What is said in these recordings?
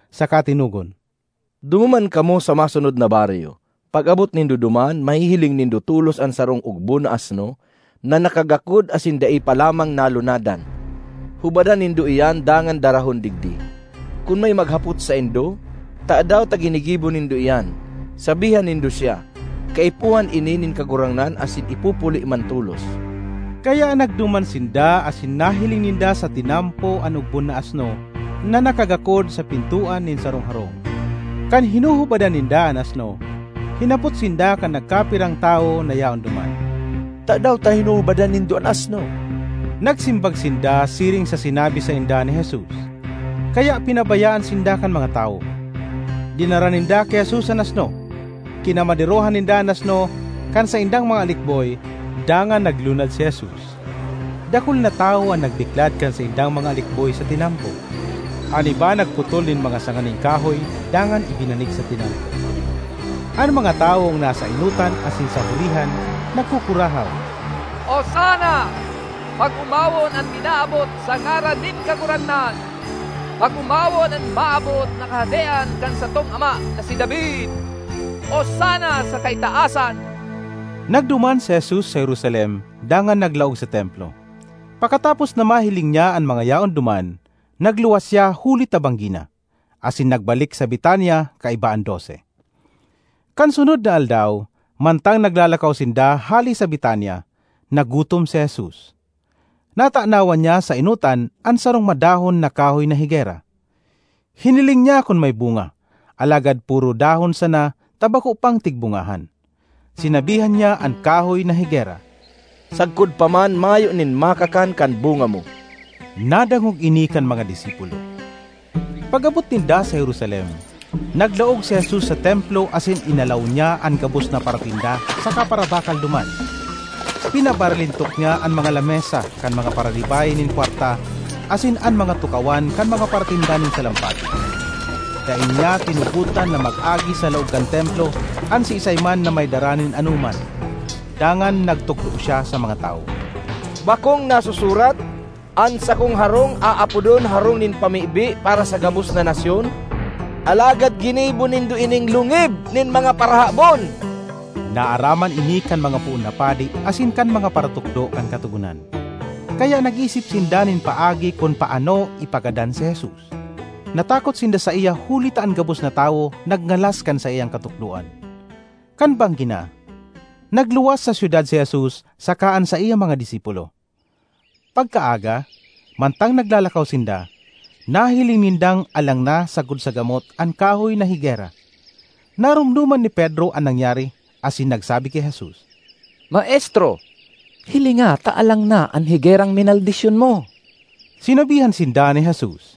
saka tinugon, “Dumuman kamo sa masunod na baryo. Pag-abot nindo duman mahihiling nindo tolos an sarong ogbon na asno na nakagakod asin dai pa lamang nalunadan. Hubadan nindo iyan dangan darahon digdi. Kun may maghapot saindo, ‘Tadaw ta ginigibo nindo iyan?’ sabihan nindo siya, ‘Kaipuhan ini nin Kagurangnan asin ipupuli man tolos.’” Kaya nagduman sinda asin nahiling ninda sa tinampo an ogbon na asno na nakagakod sa pintoan nin sarong harong. Kan hinuhubadan ninda an asno, hinapot sinda kan nagkapirang tawo na yaon duman, “Tadaw ta hinuhubadan nindo an asno?” Nagsimbag sinda siring sa sinabi sainda ni Jesus, kaya pinabayaan sinda kan mga tawo. Dinara ninda ki Jesus an asno, kinamaderohan ninda an asno kan saindang mga alikboy dangan naglunad si Jesus. Dakul na tawo an nagbiklad kan saindang mga alikboy sa tinampo; an iba nagputol nin mga sanga nin kahoy dangan ibinanig sa tinampo. An mga tawong nasa enotan asin sa hurihan nagkukurahaw, “Osana! Pag-omawon an minaabot sa ngaran nin Kagurangnan! Pag-omawon an maabot na kahadean kan satong ama na si David! Osana sa kaitaasan!” Nagduman si Jesus sa Jerusalem dangan naglaog sa Templo. Pakatapos na mahiling niya an mga yaon duman, nagluwas siya huli ta banggi na, asin nagbalik sa Betania kaiba an Dose. Kan sunod na aldaw, mantang naglalakaw sinda hale sa Betania, nagutom si Jesus. Natanawan niya sa enotan an sarong madahon na kahoy na higera. Hiniling niya kun may bunga, alagad poro dahon sana ta bako pang tigbungahan. Sinabihan niya an kahoy na higera, “Sagkod pa man mayo nin makakan kan bunga mo!” Nadangog ini kan mga disipulo. Pag-abot ninda sa Jerusalem, naglaog si Jesus sa Templo asin inalaw niya an gabos na paratinda saka parabakal duman. Pinabaralintok niya an mga lamesa kan mga pararibay nin kwarta asin an mga tukawan kan mga paratinda nin salampati. Dai niya tinugotan na mag-agi sa laog kan Templo an siisay man na may dara nin anoman. Dangan nagtukdo siya sa mga tawo, “Bakong nasusurat, ‘An sakong harong aapodon harong nin pamibi para sa gabos na nasyon’? Alagad ginibo nindo ining lungib nin mga parahabon!” Naaraman ini kan mga poon na padi asin kan mga paratukdo kan Katogonan, kaya nag-isip sinda nin paagi kun paano ipagadan si Jesus. Natakot sinda saiya huli ta an gabos na tawo nagngalas kan saiyang katukdoan. Kan banggi na, nagluwas sa syudad si Jesus saka an saiyang mga disipulo. Pagkaaga, mantang naglalakaw sinda, nahiling nindang alang na sagkod sa gamot an kahoy na higera. Naromdoman ni Pedro an nangyari asin nagsabi ki Jesus, “Maestro, hilinga ta alang na an higerang minaldisyon mo!” Sinabihan sinda ni Jesus,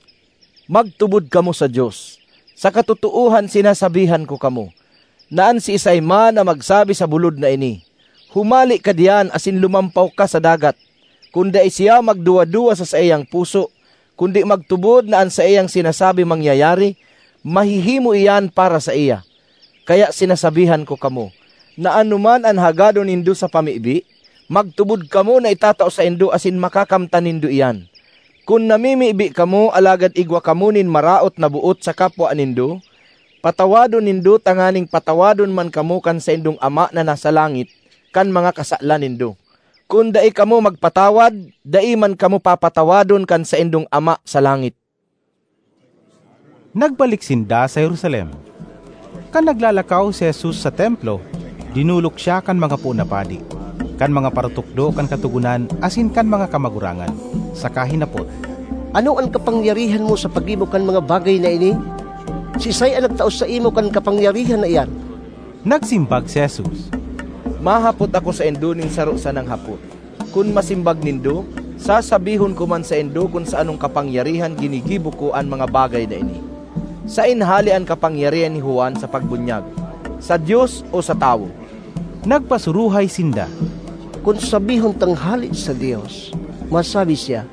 “Magtubod kamo sa Dios. Sa katotoohan sinasabihan ko kamo, na an siisay man na magsabi sa bulod na ini, ‘Humale ka diyan asin lumampaw ka sa dagat.’ Kun dai siya magduwa-duwa sa saiyang puso, kundi magtubod na an saiyang sinasabi mangyayari, mahihimo iyan para saiya. Kaya sinasabihan ko kamo, na anoman an hagadon nindo sa pamibi, magtubod kamo na itatao saindo asin makakamtan nindo iyan. Kun namimibi kamo alagad igwa kamo nin maraot na boot sa kapwa nindo, patawadon nindo tanganing patawadon man kamo kan saindong Ama na nasa langit kan mga kasalan nindo. Kun dai kamo magpatawad, dai man kamo papatawadon kan saindong Ama sa langit.” Nagbalik sinda sa Jerusalem. Kan naglalakaw si Jesus sa Templo, dinolok siya kan mga poon na padi, kan mga paratukdo kan Katogonan asin kan mga kamagurangan saka hinapot, “Ano an kapangyarihan mo sa paggibo kan mga bagay na ini? Siisay an nagtao saimo kan kapangyarihan na iyan?” Nagsimbag si Jesus, “Mahapot ako saindo nin saro sanang hapot; kun masimbag nindo, sasabihon ko man saindo kun sa anong kapangyarihan ginigibo ko an mga bagay na ini. Saen hale an kapangyarihan ni Juan sa pagbunyag: sa Dios o sa tawo?” Nagpasuruhay sinda, “Kun sabihon tang hale sa Dios, masabi siya,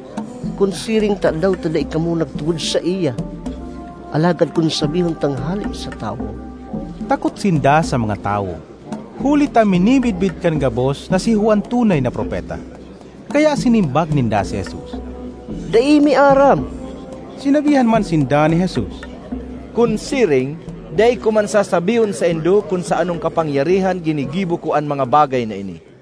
‘Kun siring, tadaw ta dai kamo nagtubod saiya?’ Alagad kun sabihon tang ‘Hale sa tawo…’” (Takot sinda sa mga tawo, huli ta minimidbid kan gabos na si Juan tunay na propeta.) Kaya sinimbag ninda si Jesus, “Dai mi aram.” Sinabihan man sinda ni Jesus, “Kun siring, dai ko man sasabihon saindo kun sa anong kapangyarihan ginigibo ko an mga bagay na ini.”